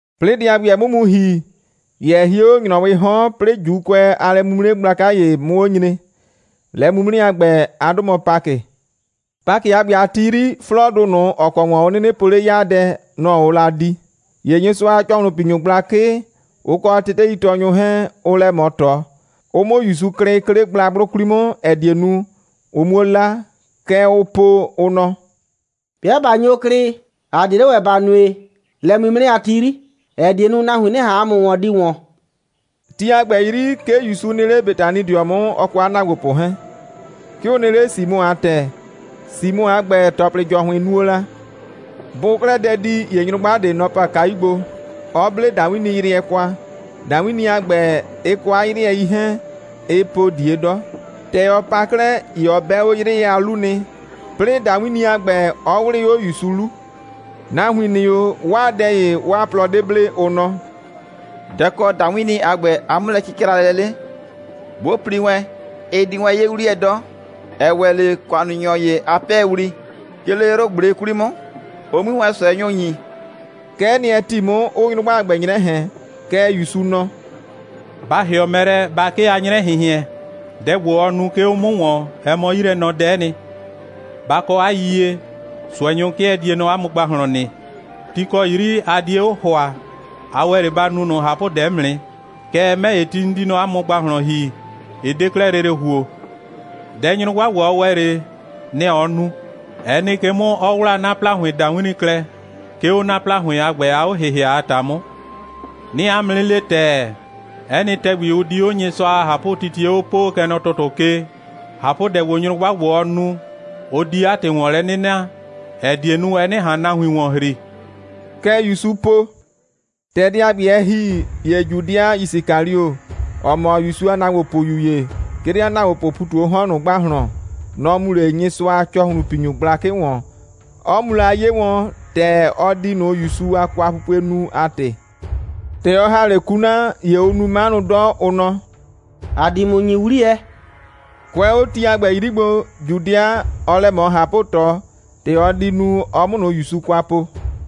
'Plɩɩ dɛ a ‑gbɛ, ɛ 'mʋ mu ‑hi, ‑ye ɛ hie 'le ‑nyrɔwɩɩ 'hɔn, 'plɩɩ ‑Juukʋɛ a lɛ'mimre gblaka ‑ye 'mʋ 'o nyre. Lɛ'mimre a ‑gbɛ, 'a 'dʋ mɔ Pakɩ. Pakɩ a ‑gbɛ a ti 'yri, 'flɔɔdʋ ꞊nʋ, ‑ɔ kɔ ‑wɔn ʋ 'nɩnɩ po 'le 'yaadɛ, nʋ‑ ʋʋ la di. ‑Ye Nyɩsʋa a ‑cɔhlʋnpinyʋ gblakɩ, ʋ kɔ teteitɔɔnyʋ 'hɛɛn, ʋʋ lɛ ꞊mɔ ꞊tɔ, ʋ 'mʋ ‑Yusu klɩ, 'ke 'le gblagblʋ 'kwli 'mʋ, ‑ɛ die nu, ʋ 'muo 'la. Kɛ ʋʋ po, ʋ nɔ: «'Bɩa ꞊ba nyo klɩ, ‑a 'die 'le ‑wɛ ‑ba nue lɛ'mimre a ti 'yri, ‑ɛ die nu, nahuin 'nɩ ꞊han ‑a mʋ ‑wɔn di ‑wɔn.» Ti a ‑gbɛ 'yri, 'ke ‑Yusu nɩ 'le Betanidɩɔ 'mʋ, ɔ kɔ 'a ‑naagbopʋ 'hɛɛn. 'Ke ʋ nɩ 'le Simɔ a ‑tɛ. Simɔ a ‑gbɛ, ‑tɔplɩ ‑jɔhʋɩn nuo la. Bʋʋ 'klɛɛ dɛ di, ‑ye nyrʋgba ꞊de, nɔ‑ pa kayu gbo, 'ɔ 'ble ‑dawinniyrɩɛ kwa. ‑Dawinni a ‑gbɛ, ɩ kɔ 'a 'yrɩɛ 'hɛɛn, ɩɩ po ꞊die 'dɔ. ‑Tɛ ɔ pa 'klɛɛ, ‑ye ɔ 'bɛ 'o 'yrɩɛ a 'lu nɩ, 'plɩɩ ‑dawinni a ‑gbɛ, 'ɔ 'wlɩɩ 'o ‑Yusu 'lu. Nahuin ‑nɩ 'o, 'waa dɛ ‑ye, 'waa plɔ 'de ble, ʋ nɔ: «Dɛ‑ kɔ ‑dawinni a ‑gbɛ a 'mʋlɛcɩcralɛ 'le? 'Bʋ pli wɛn, ɩ di wɛn 'ye 'wliyɛ 'dɔ, ‑ɛ ‑wɛ 'le ‑kʋannunyɔ ‑ye a 'pɛɛwli, 'ke 'le 'yrʋ꞊gble 'kwli 'mʋ, ʋ 'mui wɛn ꞊sʋɛnyʋ ‑nyi.» Kɛ'ɛ nɩ, ɛ ‑ti 'mʋ, 'ʋʋ nyrʋgba a ‑gbɛ 'nyrɛ ꞊hɛn. Kɛɛ, ‑Yusu nɔ: «Ba ‑hɩɔ mɛ lɛ, ba 'kee 'a 'nyrɛ꞊hɩnhɩɛn! Dɛ ‑gbo, ɔ nu, 'ke 'o 'mʋ ‑wɔn, ɛ mɔ 'yilɛnɔdɛ'ɛ nɩ. Ba kɔ 'a yiyie, ꞊sʋɛnyʋ 'kɩɛ die nɔ 'a mʋ ‑gbahlɔn nɩ. Ti ‑kɔ 'yri a die 'o ‑hʋa, a ‑wɛ 'le ba nu ꞊nʋ ꞊hapʋdɛ 'mʋ nɩ. Kɛɛ, 'mɛ ‑ye, ti 'n di nɔ 'a mʋ ‑gbahlɔn ‑hi, ɩ 'de 'klɛɛ lele ‑huo. Dɛ nyrʋgba ‑gbo, ɔ ‑wɛ 'le, nɛ‑ ɔ nu: ɛ nɩ ke 'mʋ, 'ɔ 'wlaa 'na ‑plahʋɩn ‑dawinni klɛ, 'ke 'o 'na ‑plahʋɩn a ‑gbɛ a 'o‑hɩhɩa a ‑ta 'mʋ. 'Nɩɩ 'a mʋ 'nɩ le ‑tɛɛ, 'ɛ nɩ ‑tɛgbi, ʋ di 'o Nyɩsʋa a ꞊hapʋtitie 'o poo, kɛ nɔ ‑tʋtʋ ke, ꞊hapʋdɛ ‑gbo, nyrʋgba ‑gbo, ɔ nu, ʋ di 'a ‑tɩ ‑wɔn lɛ 'nɩ na, ‑ɛ die nu, ɩ 'nɩ ꞊han nahuin ‑wɔn ‑hri.» Kɛ ‑Yusu po. ‑Tɛ dɛ a ‑gbɛ, ɛ ‑hi, ‑ye Judɩa Yisikalio, ‑ɔ mɔ ‑Yusu a ‑naagbopʋyu ‑ye, 'ke 'le 'a ‑naagbopʋʋ ‑pu ꞊tu 'o 'hɔn ꞊nʋ ‑gbahlɔn, nɔ‑ mu 'le Nyɩsʋa a ‑cɔhlʋnpinyʋ gblakɩ ‑wɔn, 'ɔ mu la 'ye wɔn, ‑tɛ ɔ di ꞊nʋ ‑Yusu a kwapupue nu a ‑tɩ. ‑Tɛ ɔ ‑ha 'le kuna, ‑ye ʋʋ nu 'manʋ 'dɔ, ʋ nɔ: «‑A di ‑mʋ ‑nyi 'wliyɛ.» Kʋɛ 'o ti a ‑gbɛ 'yri gbo, Judɩa, ɔɔ lɛ ꞊mɔ ꞊hapʋ꞊tɔ, ‑tɛ ɔ di nu, ɔ 'mʋ ꞊nʋ ‑Yusu kwa po.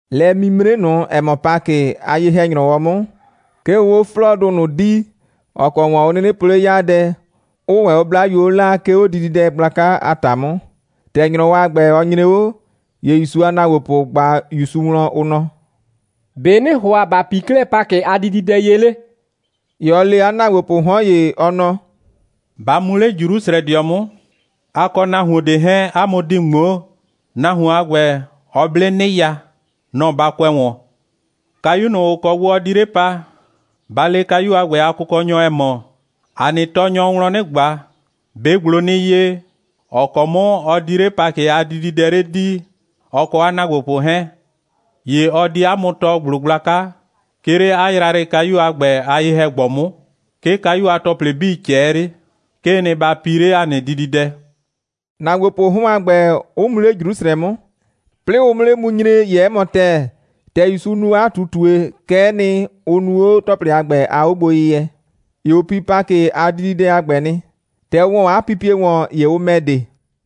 Lɛ'mimre ꞊nʋ, ‑ɛ mɔ Pakɩ, 'a ye‑hɛ‑nyrɔwɔ 'mʋ, 'ke ʋʋ 'o 'flɔɔdʋ ꞊nʋ dii, ‑ɔ kɔ ‑wɔn ʋ 'nɩnɩ po 'le 'yaadɛ, 'ʋʋ ‑wɛ 'o 'blayuo 'laa, 'ke 'o dididɛ gblaka a ‑ta 'mʋ. ‑Tɛ ‑nyrɔwɔ a ‑gbɛ, ɔ nyre 'o, ‑ye ‑Yusu a ‑naagbopʋ ꞊gba ‑Yusu wlɔn, ʋ nɔ: «‑Be' ‑nɩɩ ‑hʋa ‑ba pii 'klɛɛ Pakɩ a dididɛ ye 'le?» ‑Ye ɔ le 'a ‑naagbopʋʋ 'hɔn ‑ye, ɔ nɔ: «Ba mu 'le Jrusrɛdɩɔ 'mʋ. A kɔ nahuon ꞊de 'hɛɛn, 'a mʋ di ꞊ŋmoo. Nahuon a ‑gbɛ, ɔ 'ble 'nɩya. Nɔ‑ ba kʋɛ ‑wɔn. Kayu ꞊nʋ, ‑ʋ kɔ gbo ɔ di 'le pa, ba le kayu a ‑gbɛ a kʋkɔnyɔ, ‑ɛ mɔ: ‑A nɩ Tɔɔnyɔɔ wlɔn 'nɩ ꞊gba: ‑Be' ‑gblo nɩ ye, ‑ɔ kɔ 'mʋ ɔ di 'le Pakɩ a dididɛ 'le dii, ɔ kɔ 'a ‑naagbopʋ 'hɛɛn? ‑Ye ɔ di 'a mʋ tɔɔ ‑gblo gblaka, 'ke 'le 'a yrayrɩkayu a ‑gbɛ a ye‑hɛ‑gbɔ 'mʋ. 'Ke kayu a ‑tɔplɩ 'bii ꞊cɛɛ 'le. 'Kee nɩ, ba pii 'le ‑a nɩ dididɛ,» ‑naagbopʋʋ 'hɔn a ‑gbɛ 'ʋ mu 'le Jrusrɛ 'mʋ. 'Plɩɩ ʋ 'mʋ 'le mu nyre, ‑ye 'ɛ mɔ ‑tɛɛ, ‑tɛ ‑Yusu nu 'a ꞊tutue, kɛ'ɛ nɩ, ʋ nu 'o ‑tɔplɩ a ‑gbɛ a 'ogboyɩyɛ. ‑Ye ʋ pi Pakɩ a dididɛ a ‑gbɛ nɩ. ‑Tɛ ʋ ‑wɔ 'a pipie ‑wɔn, ‑ye ʋ ‑mɛ de.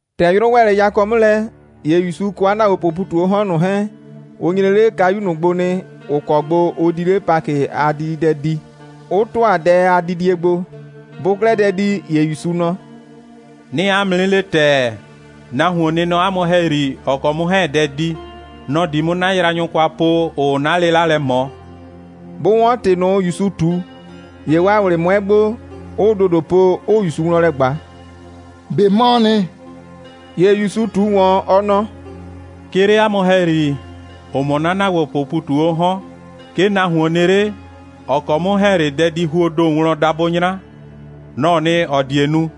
‑Tɛ 'yrʋ ‑wɛ 'le yakɔ 'mʋ lɛ, ‑ye ‑Yusu kɔ 'a ‑naagbopʋʋ ‑pu ꞊tu 'o 'hɔn ꞊nʋ 'hɛɛn, ʋ nyre 'le kayu ꞊nʋ gbo nɩ, ‑ʋ kɔ gbo ʋ di 'le Pakɩ a dididɛ dii, 'ʋ ‑tʋa dɛ a didie gbo. Bʋʋ 'klɛɛ dɛ di, ‑ye ‑Yusu nɔ: «'Nɩɩ 'a mʋ 'nɩ le ‑tɛɛ, nahuon nɩ nɔ 'a mʋ ‑hɛyri, ‑ɔ kɔ 'mʋ 'hɛɛn‑ dɛ di. Nɔ‑ di 'mʋ 'na yraanyʋ kwa po, ‑ʋʋ 'na 'lɩla lɛ ꞊mɔ.» Bʋ 'wɔn ‑tɩ ꞊nʋ, ‑Yusu ꞊tu, ‑ye 'waa ꞊wlɩ 'mʋɛ gbo, 'ʋʋ ‑dodo po, 'ʋʋ ‑Yusu wlɔn lɛ ꞊gba: «꞊Be 'mɔɔ nɩ?» ‑Ye ‑Yusu ꞊tu ‑wɔn, ɔ nɔ: «'Ke 'le 'a mʋ ‑hɛyri, ‑ʋ mɔ 'na ‑naagbopʋʋ ‑pu ꞊tu 'o 'hɔn, 'ke nahuon nɩ 'le, ‑ɔ kɔ 'mʋ 'hɛɛn‑ 'le dɛdihuoo ‑do wlɔn dabʋ 'nyra. Nɔ‑ɔ nɩ, ‑ɔ die nu.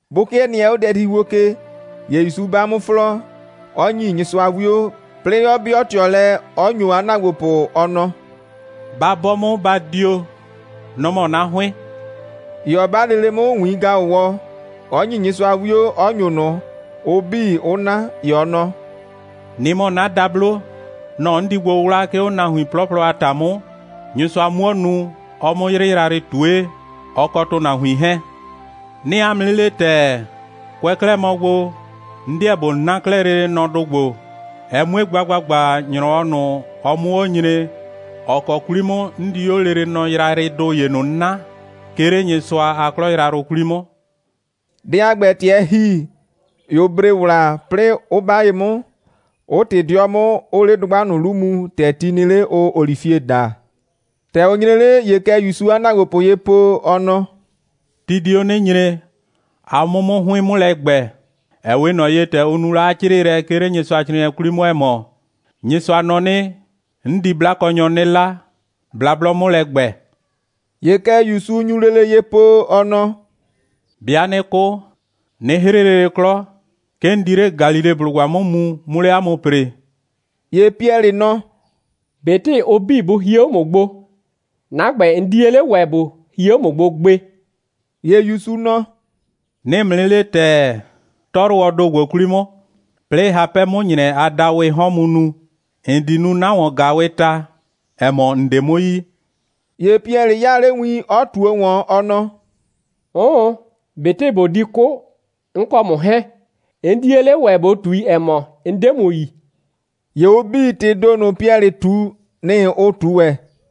Bʋ 'kɩɛ nɩɛ 'o dɛdihuo ke, ‑ye ‑Yusu 'ba 'mʋ 'flɔɔ, 'ɔ ‑nyi Nyɩsʋa 'wio, 'plɩɩ 'ɔ 'bɩɔ ꞊tɩɔ lɛ, 'ɔ ‑nyo 'a ‑naagbopʋ, ɔ nɔ: «Ba 'bɔ 'mʋ, ba dio. Nɔ‑ mɔ 'na 'hʋɩn.» ‑Ye ɔ 'ba lele 'mʋ ‑wiin‑gaʋwɔ, 'ɔ ‑nyi Nyɩsʋa 'wio, 'ɔ ‑nyo ꞊nʋ, ʋ 'bii 'ʋ 'na. ‑Ye ɔ nɔ: «Nɩ‑ mɔ 'na dablo. Nɔ‑ 'n di gbo 'wla, 'ke 'o nahuin 'plɔplɔ a ‑ta 'mʋ, Nyɩsʋa 'muo nu, ɔ 'mʋ 'yrɩ yrayrɩ ꞊tue, ɔ kɔ ‑tʋnahuin 'hɛɛn. 'Nɩɩ 'a mʋ 'nɩ le ‑tɛɛ, kʋɛ 'klɛɛ mɔ gbo, 'n 'deɛ ꞊bo 'na 'klɛɛ lele nɔdʋ ‑gbo, ɛ 'mue gba ‑gbagba, ‑nyrɔwɔ ꞊nʋ, ɔ 'mʋ 'o nyre, ‑ɔ kɔ 'kwli 'mʋ 'n di 'o lele nɔ yrayrɩdʋ ‑ye ꞊nʋ 'naa, 'ke 'le Nyɩsʋa a 'klɔ yrayrʋ 'kwli 'mʋ.» Dɛ a ‑gbɛ, ‑tɛ ɛ ‑hi, ‑ye ʋ bre ‑wla, 'plɩɩ 'ʋ 'ba ye 'mʋ, 'ʋ ꞊tɩ 'dɩɔ 'mʋ, 'ʋʋ 'le dʋgba ꞊nʋ 'lu mu, ‑tɛ ti nɩ 'le, ʋʋ olifie daa. ‑Tɛ ʋ nyre 'le, ‑ye kɛ ‑Yusuu 'a ‑naagbopʋ ye po, ɔ nɔ: «Ti di 'o 'nɩ nyre, a 'mʋ 'mʋ 'hʋɩn 'mʋ lɛ ‑gbɛ, ‑ɛ 'we ꞊nɔ ye, ‑tɛ ʋ nu la 'a 'crɩɩlɛ, 'ke 'le Nyɩsʋacrɩɩnɩɛ 'kwli 'mʋ, ‑ɛ mɔ: Nyɩsʋa nɔ 'nɩ: 'N di 'blakɔnyɔ 'nɩ 'la, blablɔ 'mʋ lɛ ‑gbɛ.» ‑Ye kɛ ‑Yusu nyu lele ye po, ɔ nɔ: «'Bɩa 'nɩ 'kʋ, 'nɩ 'hrɩ lele 'klɔ, 'ke 'n di 'le Galileblʋgba 'mʋ mu, 'mʋ 'le 'a mʋ ‑pree.» ‑Ye Piɛlɩ nɔ: «꞊Betɩ ʋ 'bii bʋ hie 'o ‑mʋ gbo, 'na ‑gbɛ, 'n 'die 'le ‑wɛ ꞊bo hie 'o ‑mʋ gbo gbe.» ‑Ye ‑Yusu nɔ: «'Nɩɩ ‑mʋ 'nɩ le ‑tɛɛ, 'tɔyrʋwɔɔ ‑do ‑gbo 'kwli 'mʋ, 'plɩɩ hapɛ 'mʋ ‑nyrɛ a dawɩɩ 'hɔn mu nu, ‑n di nu 'na ‑wɔn‑gaawɩɩ ta, ‑ɛ mɔ, ‑n 'de 'mʋ yi.» ‑Ye Piɛlɩ 'yaa 'le win, 'ɔ ꞊tuo ‑wɔn, ɔ nɔ: «'Ʋʋn, ꞊betɩ ꞊bo di 'kʋ, 'n kɔ ‑mʋ 'hɛɛn, 'n 'die 'le ‑wɛ ꞊bo ꞊tui, ‑ɛ mɔ, 'n 'de ‑mʋ yi.» ‑Ye ʋ 'bii, ‑tɩɩ ‑do ꞊nʋ, Piɛlɩ ꞊tu, nɩ‑ ʋ ꞊tu ‑wɛ.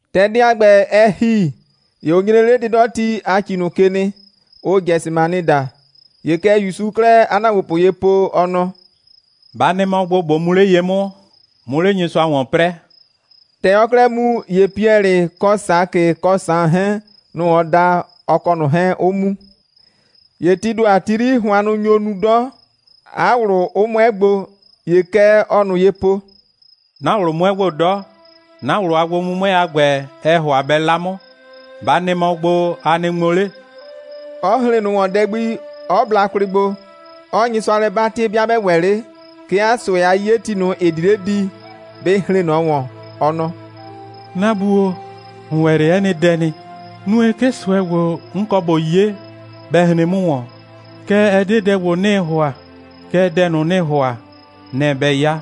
‑Tɛ dɛ a ‑gbɛ, ɛ ‑hi, ‑ye ʋ nyre 'le 'dɩdɔti a ‑ci ꞊nʋ ke nɩ, ʋʋ Gɛsɩmanɩ daa. ‑Ye kɛ ‑Yusuu 'klɛɛ 'a ‑naagbopʋ ye po, ɔ nɔ: «Ba nɩ mɔ gbo, ꞊bo mu 'le ye 'mʋ, 'mʋ 'le Nyɩsʋa ‑wɔn 'prɛɛ.» ‑Tɛ ɔɔ 'klɛɛ mu, ‑ye Piɛlɩ kɔ Sakɩ kɔ Saan 'hɛɛn, nʋ‑ ɔ da, ɔ kɔ ꞊nʋ 'hɛɛn 'ʋ mu. ‑Ye tii ‑do a ti 'yri, hʋannʋ nyo nu 'dɔ, 'a ꞊wlʋ 'ʋ 'mʋɛ gbo. ‑Ye kɛ ɔɔ ꞊nʋ ye po: «'Na ꞊wlʋ 'mʋɛ gbo 'dɔ. 'Na ꞊wlʋ a gbo'mʋmʋɛ a ‑gbɛ, ɛɛ ‑hʋa bɛ 'la 'mʋ. Ba nɩ mɔ gbo, a nɩ ŋmo 'le,» 'ɔ hren ꞊nʋ ‑wɔn dɛ gbi, 'ɔ bla kwlɩ gbo, 'ɔɔ Nyɩsʋa lɛ 'batɩ, 'bɩa 'bɛ ‑wɛ 'le, 'ke 'a ꞊sʋɛ'yeti ꞊nʋ, ‑ɩ di 'le di, bɩ hren ꞊nɔ ‑wɔn. Ɔ nɔ: «'Na Bu o, ‑n ‑wɛ 'le 'ɛ nɩ dɛ nɩ. Nue, 'ke ꞊sʋɛ ‑gbo, 'n kɔ ꞊bo 'ye, bɛ hren 'mʋ ‑wɔn. Kɛɛ, ɛ 'de dɛ ‑gbo, 'nɩɩ ‑hʋa, kɛɛ dɛ ꞊nʋ, ‑nɩɩ ‑hʋa, nɛ‑ bɛ 'ya.»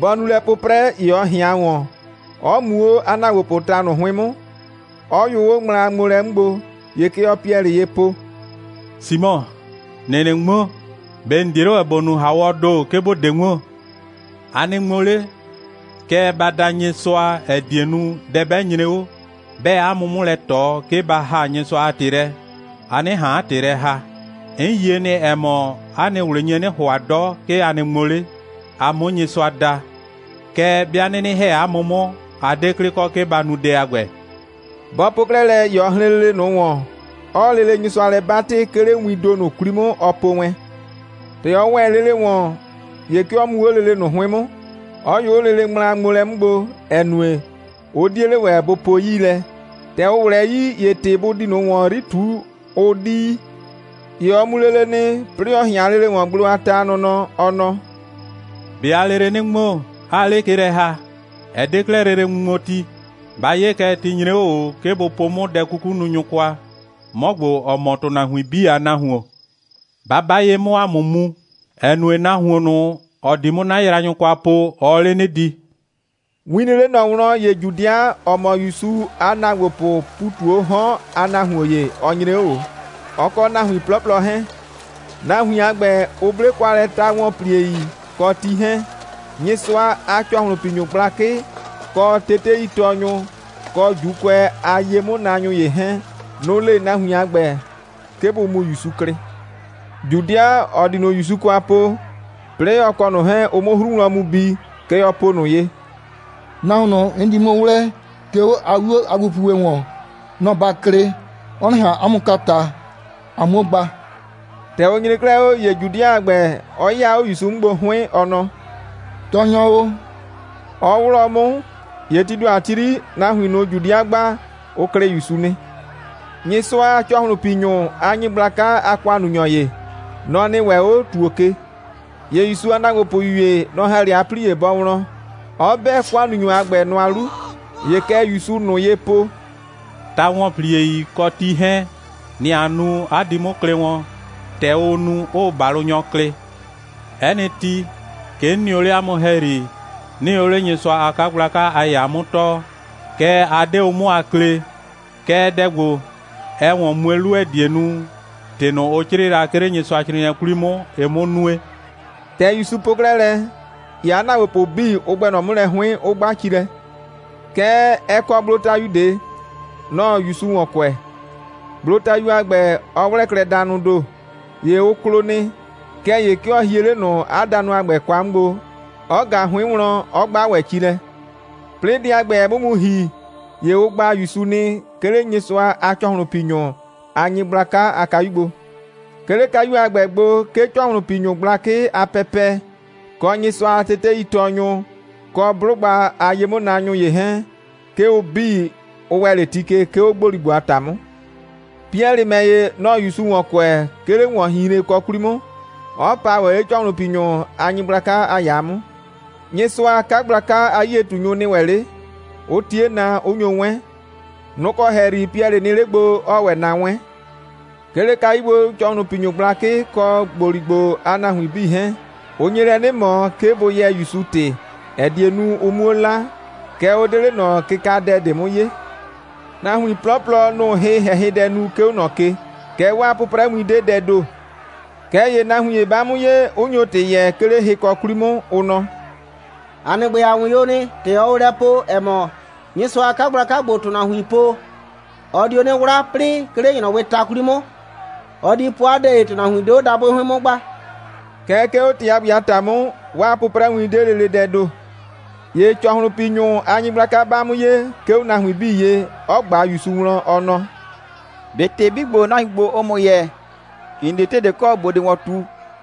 Bɔ nu lɛ 'pʋprɛ, ‑ye ɔ ꞊hɩan ‑wɔn, 'ɔ mu 'o 'a ‑naagbopʋʋ ta ꞊nʋ 'hʋɩn 'mʋ, 'ɔ yʋ 'o ŋmla a ŋmoolɛ 'mʋ gbo. ‑Ye kɛ ɔɔ Piɛlɩ ye po: «Simɔ, ‑nɩɩ 'nɩ ŋmo? ꞊Be ‑n 'die 'le ‑wɛ ‑bo nu ‑haawɔɔ ‑do, 'ke ‑bo 'de ŋmo? A nɩ ŋmo 'le, kɛɛ, ba da Nyɩsʋa, ‑ɛ die nu, dɛ 'bɛ nyre 'o, 'bɛɛ 'a mʋ 'mʋ lɛ ꞊tɔ, 'ke ba ‑haa Nyɩsʋa a ‑tɩ lɛ, a 'nɩ ꞊han 'a ‑tɩ lɛ ‑haa. 'N yie nɩ, ‑ɛ mɔ, 'a nɩ ꞊wlɩ nye 'nɩ ‑hʋa 'dɔ, 'ke a nɩ ŋmo 'le, a 'mʋ Nyɩsʋa da, kɛɛ, 'bɩa 'nɩnɩ ‑hɛ 'a mʋ 'mʋ, a 'de 'klɩ kɔ, 'ke ba nu dɛ a ‑gbɛ.» Bɔ po 'klɛɛ lɛ, ‑ye ɔ hren lele ꞊nʋ ‑wɔn, 'ɔɔ lele Nyɩsʋa lɛ 'batɩ, 'ke 'le wiin ‑do ꞊nʋ 'kwli 'mʋ, ɔ po wɛn. ‑Tɛ ɔ ‑wɛ lele ‑wɔn, ‑ye 'ke ɔ mu 'o lele ꞊nʋ 'hʋɩn 'mʋ, 'ɔ yʋ 'o lele ŋmlaŋmoolɛ 'mʋ gbo, ‑ɛ nue, ʋ 'die 'le ‑wɛ, bʋ po 'yii lɛ. ‑Tɛ ʋ ꞊wlɛɛ 'yii, ‑ye ‑tɩ bʋ di ꞊nɔ 'yri ‑wɔn ꞊tuu, ʋ 'di yi. ‑Ye ɔ mu lele nɩ, 'plɩɩ 'ɔ ꞊hɩan lele ‑wɔn, gblo a ta a nɔnɔ, ɔ nɔ: «꞊Be aa lele 'nɩ ŋmo, 'aa 'le ke lɛ ‑ha? Ɛ 'de 'klɛɛ lele ŋmuŋmoti. Ba 'ye kɛ, ti nyre 'o ꞊o, 'ke bʋ po 'mʋ dɛ'kukununyʋ kwa, 'mɔ ‑gbo, ‑ɔ mɔ ‑tʋnahuin 'bii a Nahuon. Ba 'ba ye 'mʋ, ‑a 'mʋ mu, ‑ɛ nue, nahuon ꞊nʋ, ‑ɔ di 'mʋ 'na yraanyʋ kwa po, ɔɔ 'le 'nɩ di.» Win nɩ 'le ‑Yusu wlɔn, ‑ye Judɩa, ‑ɔ mɔ ‑Yusu a ‑naagbopʋʋ ‑pu ꞊tu 'o 'hɔn a nahuon ‑ye, ɔ nyre 'o ꞊o, ɔ kɔ nahuin 'plɔplɔ 'hɛɛn. Nahuin a ‑gbɛ, ʋ 'ble kwa lɛ ta‑wɔnpliei kɔ ti 'hɛɛn. Nyɩsʋa a ‑cɔhlʋnpinyʋ gblakɩ, kɔ teteitɔɔnyʋ, kɔ ‑Juukʋɛ a ye'mʋnaanyʋ ‑ye 'hɛɛn, nʋ‑ le nahuin a ‑gbɛ, 'ke bʋ mu ‑Yusu klɩ. Judɩa, ‑ɔ di ꞊nʋ ‑Yusu kwa po, 'plɩɩ ɔ kɔ ꞊nʋ 'hɛɛn, ʋ 'mʋ 'hru wlɔn mu bi, kɛ ɔ po ꞊nʋ ye: «Nahuon ꞊nʋ, 'n di 'mʋ 'wlɛɛ, 'ke 'o 'a 'wio a gbopupue ‑wɔn, nɔ‑ ba klɩ, ɔ 'nɩ ꞊han 'a mʋ kwa ꞊ta, a 'muo gba.» ‑Tɛ ʋ nyre 'klɛɛ 'o, ‑ye Judɩa a ‑gbɛ, ɔ 'yɩya 'o ‑Yusu 'mʋ gbo 'hʋɩn, ɔ nɔ: «Tɔɔnyɔ o,» 'ɔ 'wlɔɔ 'mʋ. ‑Ye tii ‑do a ti 'yri, nahuin ꞊nʋ, Judɩa gba, ʋ klɩ ‑Yusu nɩ. Nyɩsʋa a ‑cɔhlʋnpinyʋ a nyɩgblaka a ‑kʋannunyɔ ‑ye, nɔ‑ nɩ ‑wɛ 'o ‑tuo ke. ‑Ye ‑Yusu a ‑naagbopʋyu ‑ye, nɔ‑ ‑ha 'le 'a 'plie bɔ wlɔn, 'ɔ 'bɛ ‑kʋannunyɔ a ‑gbɛ nʋa 'lu. ‑Ye kɛ ‑Yusuu ꞊nʋ ye po: «Ta‑wɔnpliei kɔ ti 'hɛɛn, nɩ‑ a nu, 'a di 'mʋ klɩ wɔn, ‑tɛ ʋʋ nu, 'ʋʋ ‑balʋnyɔ klɩ. 'Ɛ nɩ ti, 'ke 'n nɩ o 'le 'a mʋ ‑hɛyri, 'nɩɩ o 'le Nyɩsʋa a 'kagblaka a ‑yaa 'mʋ tɔɔ, kɛɛ, a 'de o 'mʋ a klee. Kɛɛ, dɛ ‑gbo, ɛɛ ‑wɔn mue 'lu, ‑ɛ die nu, ‑tɩ ꞊nʋ, ʋ 'crɩɩ la, 'ke 'le Nyɩsʋacrɩɩnɩɛ 'kwli 'mʋ, ɩ 'mʋ nue.» ‑Tɛ ‑Yusu po 'klɛɛ lɛ, ‑ye 'a ‑naagbopʋ 'bii, ʋ ‑gbɛ ꞊nɔ 'mʋ lɛ 'hʋɩn, 'ʋ 'gba ci lɛ. Kɛɛ, ɛ kɔ gblotayu ꞊de, nɔ‑ɔ ‑Yusu ‑wɔn kʋɛ. Gblotayu a ‑gbɛ, ɔ 'wlɛɛ klɛ danʋʋ ‑do. ‑Ye ʋ klo nɩ. Kɛɛ ‑ye 'ke ɔ hie 'le ꞊nʋ danʋ a ‑gbɛ kwa 'mʋ gbo, 'ɔ ꞊ga 'hʋɩn wlɔn, 'ɔ 'gba ‑wɛ ci lɛ. 'Plɩɩ dɛ a ‑gbɛ, ɛ 'mʋ mu ‑hi, ‑ye ʋ gba ‑Yusu nɩ, 'ke 'le Nyɩsʋa a ‑cɔhlʋnpinyʋ a nyɩgblaka a kayu gbo. 'Ke 'le kayu a ‑gbɛ gbo, 'ke ‑cɔhlʋnpinyʋ gblakɩ a pɛpɛ, kɔ Nyɩsʋa a teteitɔɔnyʋ, kɔ 'blʋgba a ye'mʋnaanyʋ ‑ye 'hɛɛn, 'ke ʋ 'bii, ʋ ‑wɛ 'le ti ke, 'ke 'o ‑gboligbo a ‑ta 'mʋ. Piɛlɩ ‑mɛ ‑ye, nɔ‑ɔ ‑Yusu ‑wɔn kʋɛ, 'ke 'le ‑wɔnhinhrenkɔ 'kwli 'mʋ, 'ɔ pa ‑wɛ 'le ‑cɔhlʋnpinyʋ a nyɩgblaka a ‑yaa 'mʋ. Nyɩsʋa a 'kagblaka a 'yie꞊tunyʋ nɩ ‑wɛ 'le, 'ʋ 'tie na, 'ʋ nyo 'wɛn. Nʋ‑ kɔ ‑hɛyri Piɛlɩ nɩ 'le gbo, 'ɔɔ ‑wɛ na 'wɛn. 'Ke 'le kayu gbo, ‑cɔhlʋnpinyʋ gblakɩ kɔ ‑gboligbo a nahuin 'bii 'hɛɛn, ʋ nye lɛ 'nɩ ꞊mɔ, 'ke bʋ yɛɛ ‑Yusu ‑tɩ, ‑ɛ die nu, ʋ 'muo 'la, kɛɛ, ʋ 'de 'le ꞊nɔ kɩkadɛ ꞊de 'mʋ 'yee. Nahuin 'plɔplɔ, nʋ‑ʋ hɩ‑hɛhɩdɛ nu, 'ke 'o ꞊nɔ ke. Kɛɛ, 'waa 'pʋprɛwin 'de dɛɛ ‑do. Kɛɛ ‑ye nahuin ‑ye 'ba 'mʋ ye, 'ʋ nyo ‑tɩ yɛɛ, 'ke 'le hɩkɔ 'kwli 'mʋ, ʋ nɔ: «‑A nɩ ‑gbɛ, ‑a 'wɩn o nɩ, ‑tɛ ɔɔ o lɛ po, ‑ɛ mɔ, Nyɩsʋa a 'kagblaka ‑gbo, ‑tʋnahuin po, ɔ dio 'nɩ 'wla, 'plɩɩ, 'ke 'le ‑nyrɔwɩɩ ta 'kwli 'mʋ, ɔ di po 'a dɛ ‑ye, ‑tʋnahuin 'de 'o dabʋɩ 'hʋɩn 'mʋ gba.» Kɛɛ, 'ke 'o ‑tɩ a ‑gbɛ a ‑ta 'mʋ, 'waa 'pʋprɛwin 'de lele dɛɛ ‑do. ‑Ye ‑cɔhlʋnpinyʋ a nyɩgblaka 'ba 'mʋ ye, 'ke 'o nahuin 'bii ye, 'ɔ ꞊gba ‑Yusu wlɔn, ɔ nɔ: «꞊Be ‑tɩ 'bii ‑gbo, nahuin ‑gbo, ʋʋ ‑mʋ yɛɛ, ‑n 'de ‑tɩ ꞊de kɔ, ‑bo di ‑wɔn ꞊tu?»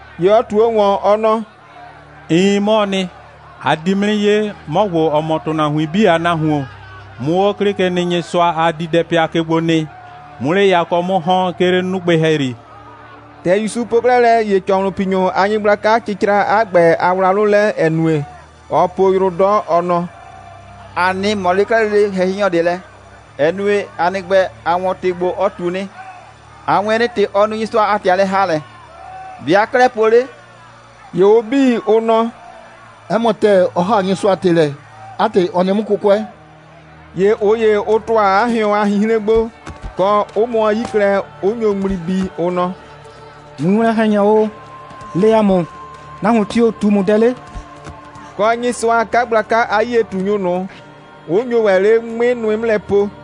‑Ye ɔ ꞊tuo ‑wɔn, ɔ nɔ: «Iin, 'mɔɔ nɩ. A di 'mʋ 'nɩ 'ye, 'mɔ ‑gbo, ‑ɔ mɔ ‑tʋnahuin 'bii a Nahuon, 'mʋ 'o 'Klɩkenɩnyɩsʋa a diidɛpɩa ke gbo nɩ, 'mʋ 'le yakɔ 'mʋ ‑hɔn, 'ke 'le 'nugbɩ ‑hɛyri.» ‑Tɛ ‑Yusu po 'klɛɛ lɛ, ‑ye ‑cɔhlʋnpinyʋ a nyɩgblaka cɩcra 'a ‑gbɛ a wlawlʋ lɛ, ‑ɛ nue, ɔɔ po yrʋ 'dɔ, ɔ nɔ: «‑A 'nɩ ꞊mɔ 'le 'klɛɛ lele ‑hɛhɩnyɔ ꞊de lɛ, ‑ɛ nue, 'a nɩ ‑gbɛ, a 'wɔn ‑tɩ ‑gbo, ɔ ꞊tu nɩ. A 'wɩn nɩ, ‑tɛ ɔ nu Nyɩsʋa a ‑tɩ a lɛ‑haalɛ. ‑Be' aa 'klɛɛ po 'le?» ‑Ye ʋ 'bii, ʋ nɔ: «'Ɛ mɔ ‑tɛɛ, ɔ ‑haa Nyɩsʋa a ‑tɩ lɛ. 'A ‑tɩ, ɔ nɩ 'mʋ 'kʋkʋɛ.» ‑Ye ꞊ʋ ‑ye, ʋ ‑tʋa 'a hɩɔn a 'hinhren gbo, kɔ, 'ʋ mʋɔ 'yi klɛ, 'ʋ nyo ŋmli bii, ʋ nɔ: «Winwlɔn‑hɛnyɔ o, le ‑a mʋ, nahuon tio‑ ꞊tu ‑mʋ dɛ 'le?» kɔ, Nyɩsʋa a 'kagblaka a 'yie꞊tunyʋ ꞊nʋ, 'ʋ nyo ‑wɛ 'le 'ŋmɩ nʋɩ 'mʋ lɛ po.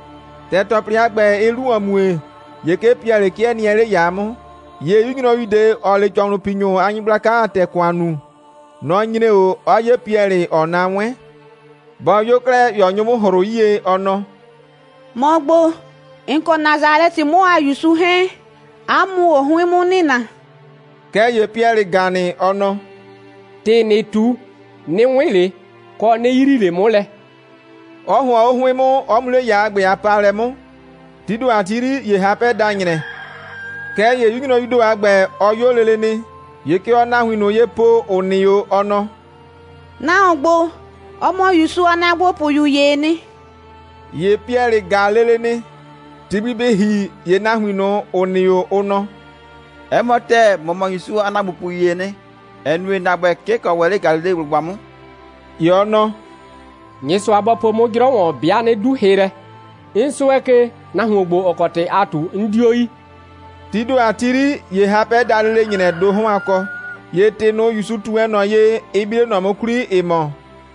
‑Tɛ ‑tɔplɩ a ‑gbɛ, ɩɩ 'lu ‑wɔn mue, ‑ye 'ke Piɛlɩ 'kɩɛ nɩɛ 'le ‑yaa 'mʋ. ‑Ye 'yu nyrɔyu ꞊de, ‑ɔɔ 'le ‑cɔhlʋnpinyʋ a nyɩgblaka a ‑tɛ ‑kʋan nuu, nɔ‑ nyre 'o, 'ɔ 'ye Piɛlɩ, ‑ɔɔ na 'wɛn. Bɔ 'yo 'klɛɛ, ‑ye ɔ nyo 'mʋ ‑hrʋ 'yie, ɔ nɔ: «‑Mɔ ‑gbo, ‑n kɔ Nasalɛtɩ 'mʋ a ‑Yusu 'hɛɛn, 'a mʋ‑ʋ o 'hʋɩn 'mʋ nɩna.» Kɛɛ ‑ye Piɛlɩ ‑ga nɩ, ɔ nɔ: «‑Tɩ ‑nɩɩ ꞊tu, 'nɩ 'wɩn ꞊le, kɔ 'nɩ yrii ꞊le 'mʋ lɛ,» 'ɔ ‑hʋɔn 'o 'hʋɩn 'mʋ, 'ɔ mu 'le ‑yaa a ‑gbɛ a paalɛ 'mʋ. Tii ‑do a ‑gbɛ 'yri, ‑ye hapɛ da ‑nyrɛ. Kɛɛ ‑ye 'yu nyrɔyuu ‑do a ‑gbɛ, ɔ 'yo lele nɩ, ‑ye kɛ ɔɔ nahuin ꞊nʋ ye po, ‑ʋ nɩ 'o, ɔ nɔ: «Nahuon ‑gbo, ɔ mɔ ‑Yusu a ‑naagbopʋyu ‑yee nɩ.» ‑Ye Piɛlɩ ‑ga lele nɩ. Ti gbi bɩ ‑hi, ‑ye nahuin ꞊nʋ, ‑ʋ nɩ 'o, ʋ nɔ: «'Ɛ mɔ ‑tɛɛ, ‑mɔ mɔ ‑Yusu a ‑naagbopʋyu ‑yee nɩ, ‑ɛ nue, ‑na ‑gbɛ, 'ke ‑n kɔ ‑wɛ 'le Galileblʋgba 'mʋ.» ‑Ye ɔ nɔ: «Nyɩsʋa bɔ po 'mʋ 'jrɔ ‑wɔn, 'bɩa 'nɩ 'du hɩ lɛ. 'N 'sʋɛ ke, nahuon ‑gbo, ‑ɔ kɔ ‑tɩ aa ꞊tu, 'n 'dio yi.» Tii ‑do a ‑gbɛ 'yri, ‑ye hapɛ da lele ‑nyrɛ ‑do 'hɔn a kɔ. ‑Ye ‑tɩ ꞊nʋ, ‑Yusu ꞊tu wɛn ꞊nɔ ye, ɩ bi 'le ꞊nɔ 'mʋ 'kwli, ‑ɩ mɔ: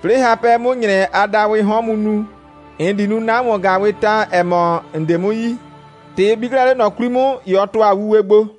«'Plɩɩ hapɛ 'mʋ ‑nyrɛ a dawɩɩ 'hɔn mu nu, ‑n di nu 'na ‑wɔn‑gaawɩɩ ta, ‑ɛ mɔ, ‑n 'de 'mʋ yi.» ‑Tɛ ɩ bi 'klɛɛ 'le ꞊nɔ 'kwli 'mʋ, ‑ye ɔ ‑tʋa wuwe gbo.